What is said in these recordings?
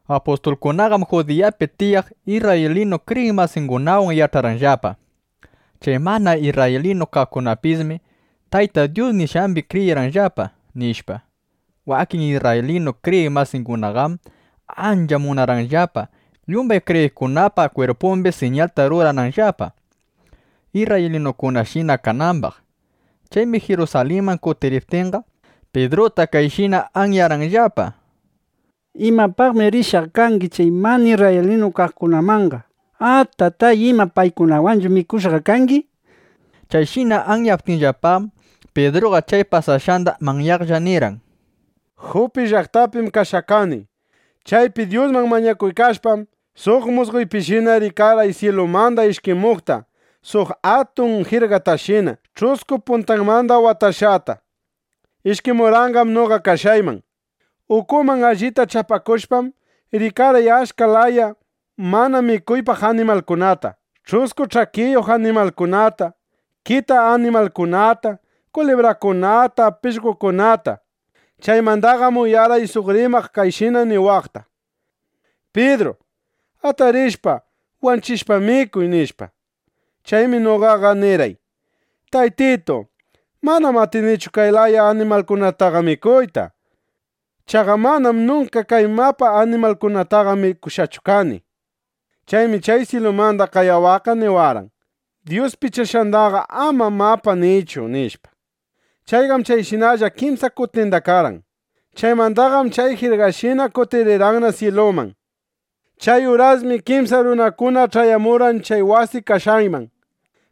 Apustulkunaqam Judiyapi tiyaq isrraylinu kriyiq masingunawan yach'arqanllapa: Chay mana isrraylinu kaqkunapisshi Tayta Dyus nishqambi kriyishqallapa, nishpa. Wakin isrraylinu kriyiq masingunaqam ancha munarqanllapa, yumbay kriyiqkunapa kwirpumbi siñalta rurananllapa, isrraylinukunashina kanambaq. Chaymi Jirusalinman kutiriptinqa, Pidruta kayshina anyarqanllapa: —¿Imapaqmi rishqa kangi chay mana isrraylinu kaqkunamanqa? ¡Atatay! ¿Ima paykunawanchu mikushqa kangi? nishpa. Chayshina anyaptinllapam, Pidruqa chay pasashqanda manyaqlla nirqan: —Jupi llaqtapim kashqa kani. Chaypi Dyusman mañakuykashpam, suq musqoypishina rikarqay syilumanda ishkimuqta suq atun jirgatashina, ch'usku puntanmanda watashqata. Ishkimurqanqam noqa kashqayman. Ukunman allita chapakushpam, rikarqay achka laya mana mikuypaq animalkunata: ch'usku ch'akiyuq animalkunata, kita animalkunata, kulibrakunata, pishqokunata. Chaymandaqam uyarqay suq rimaq kayshina niwaqta: “Pidru, atarishpa, wanchishpa, mikuy”, nishpa. Chaymi noqaqa nirqay: “Taytitu, manam atinichu kay laya animalkunataqa mikuyta. Chaqa manam nunka kay mapa animalkunataqa mikushqachu kani”, nishpa. Chaymi chay syilumanda qayawaqqa niwarqan: “Dyus pichashqandaqa ama ‘mapa’ niychu”, nishpa. Chayqam chayshinalla kimsa kutinda karqan. Chaymandaqam chay jirgashinaqa kutirirqanna syiluman. ’Chay urasmi kimsa runakuna ch'ayamurqan chay wasi kashqayman.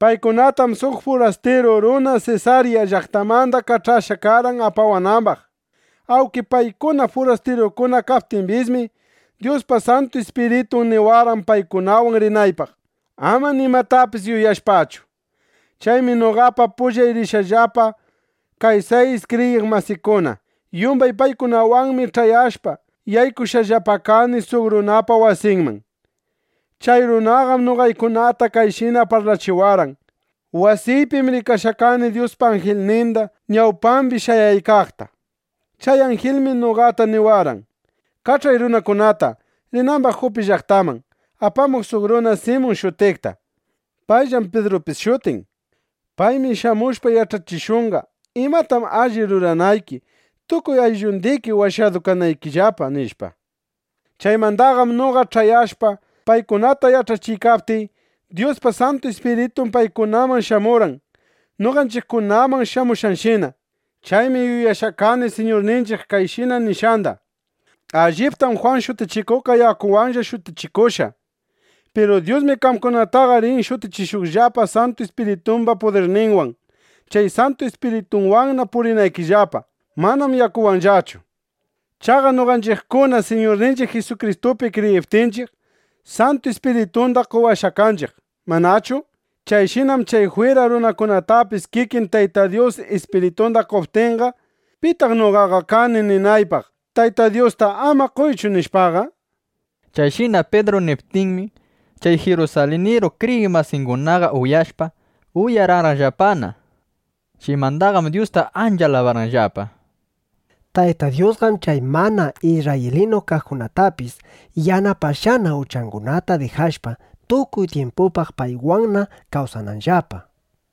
Paykunatam suq furastiru runa Sesarya llaqtamanda kach'ashqa karqan apawanambaq. Awnki paykuna furastirukuna kaptimbismi, Dyuspa Santu Ispiritun niwarqan paykunawan rinaypaq, ama nimatapis yuyashpachu. Chaymi noqapa pullay rishqallapa kay sayis kriyiq masikuna. Yumbay paykunawanmi ch'ayashpa, yaykushqallapa kani suq runapa wasinman. Chay runaqam noqaykunata kayshina parlachiwarqan: “Wasiypim rikashqa kani Dyuspa anjilninda, ñawpambi shayaykaqta. Chay anjilmi noqata niwarqan: ‘Kach'ay runakunata, rinambaq Jupi llaqtaman, apamuq suq runa Simun shutiqta. Payllam Pidrupis shutin. Paymi shamushpa yach'achishunqa, imatam alli ruranayki, tukuy ayllundiki washadu kanaykillapa’”, nishpa. Chaymandaqam noqa ch'ayashpa, paykunata yach'achiykaptiy, Dyuspa Santu Ispiritun paykunaman shamurqan, noqanchiqkunaman shamushqanshina. Chaymi yuyashqa kani Siñurninchiq kayshina nishqanda: “Alliptam Jwan Shutichikuqqa yakuwanlla shutichikushqa. Piru Dyusmi qamkunataqa rin shutichishuqllapa Santu Ispiritumba pudirninwan, chay Santu Ispiritunwanna purinaykillapa. Manam yakuwanllachu”, nishpa. Chaqa noqanchiqkunam Siñurninchiq Jisukristupi kriyiptinchiq, Santu Ispiritunda qowashqa kanchiq, ¿manachu? Chayshinam chay jwira runakunatapis kikin Tayta Dyus Ispiritunda qoptinqa, ¿pitaq noqaqa kani ninaypaq Tayta Dyusta “Ama qoychu”, nishpaqa? Chayshina Pidru niptinmi, chay jirusaliniru kriyiq masingunaqa uyashpa, uyararqanllapana. Chaymandaqam Dyusta ancha alabarqanllapa: —¡Tayta Dyusqam chay mana isrraylinu kaqkunatapis yanapashqana, uchangunata dijashpa, tukuy tyimpupaq paywanna kawsananllapa! nishpa.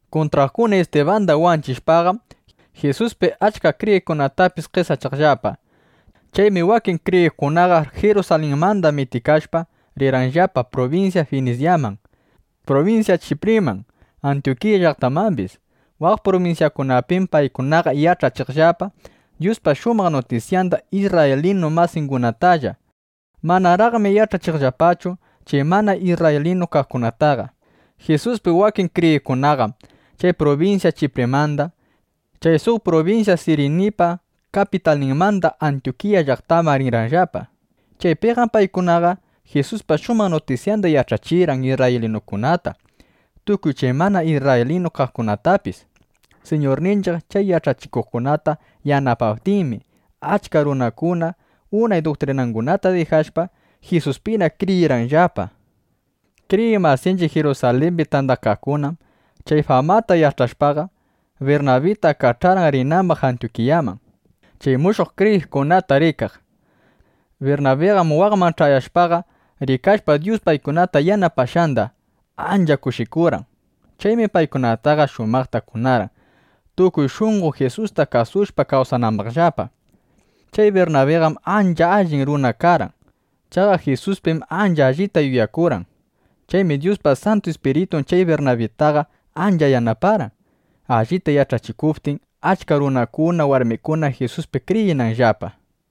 Kuntraqkuna Istibanda wanchishpaqam, Jisuspi achka kriyiqkunatapis qesachaqllapa. Chaymi wakin kriyiqkunaqa Jirusalinmanda mitikashpa, rirqanllapa prubinsya Finisyaman, prubinsya Chipriman, Antyukiya llaqtamambis. Waq prubinsyakunapim paykunaqa yach'achiqllapa Dyuspa shumaq nutisyanda isrraylinu masingunatalla. Manaraqmi yach'achiqllapachu chay mana isrraylinu kaqkunataqa. Jisuspi wakin kriyiqkunaqam chay prubinsya Chiprimanda, chay suq prubinsya Sirinipa kapitalninmanda Antyukiya llaqtaman rirqanllapa. Chaypiqam paykunaqa Jisuspa shumaq nutisyanda yach'achirqan isrraylinukunata, tukuy chay mana isrraylinu kaqkunatapis. Siñurninchiq chay yach'achikuqkunata yanapaptinmi, achka runakuna unay duktrinangunata dijashpa, Jisuspina kriyirqanllapa. Kriyiq masinchiq Jirusalimbi tandakaqkunam chay famata yach'ashpaqa, Birnabita kach'arqan, rinambaq Antyukiyaman, chay mushuq kriyiqkunata rikaq. Birnabiqam waqman ch'ayashpaqa, rikashpa Dyus paykunata yanapashqanda, ancha kushikurqan. Chaymi paykunataqa shumaqta kunarqan, tukuy shunqo Jisusta kasushpa kawsanambaqllapa. Chay Birnabiqam ancha allin runa karqan. Chaqa Jisuspim ancha allita yuyakurqan. Chaymi Dyuspa Santu Ispiritun chay Birnabitaqa ancha yanaparqan, allita yach'achikuptin, achka runakuna, warmikuna Jisuspi kriyinanllapa.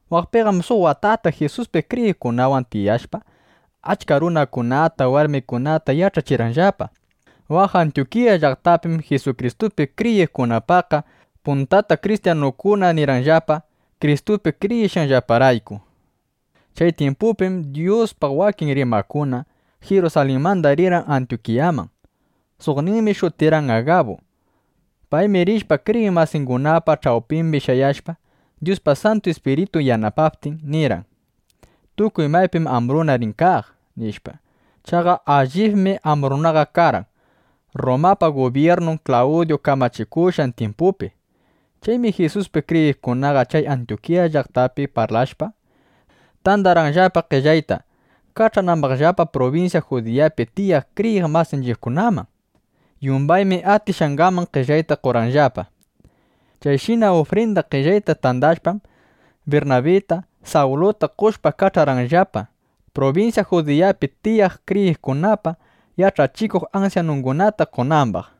Waqpiqam suq watata Jisuspi kriyiqkunawan tiyashpa, achka runakunata, warmikunata yach'achirqanllapa. Waq Antyukiya llaqtapim Jisukristupi kriyiqkunapaqqa puntata “Kristyanukuna”, nirqanllapa, Kristupi kriyishqanllaparayku. Chay tyimpupim Dyuspaq wakin rimaqkuna, Jirusalinmanda rirqan Antyukiyaman. Suqninmi shutirqan Agabu. Paymi rishpa, kriyiq masingunapa ch'awpimbi shayashpa, Dyuspa Santu Ispiritun yanapaptin, nirqan: —Tukuy maypim ambruna rin kaq, nishpa. Chaqa allibmi ambrunaqa karqan Rrumapa gubyirnun Klawdyu kamachikushqan tyimpupi. Chaymi Jisuspi kriyiqkunaqa chay Antyukiya llaqtapi parlashpa, tandarqanllapa qellayta, kach'anambaqllapa prubinsya Judiyapi tiyaq kriyiq masinchiqkunaman. Yumbaymi atishqangaman qellayta qorqanllapa. Chayshina ufrinda qellayta tandashpam, Birnabita, Sawluta qoshpa, kach'arqanllapa, prubinsya Judiyapi tiyaq kriyiqkunapa yach'achikuq ansyanungunata qonambaq.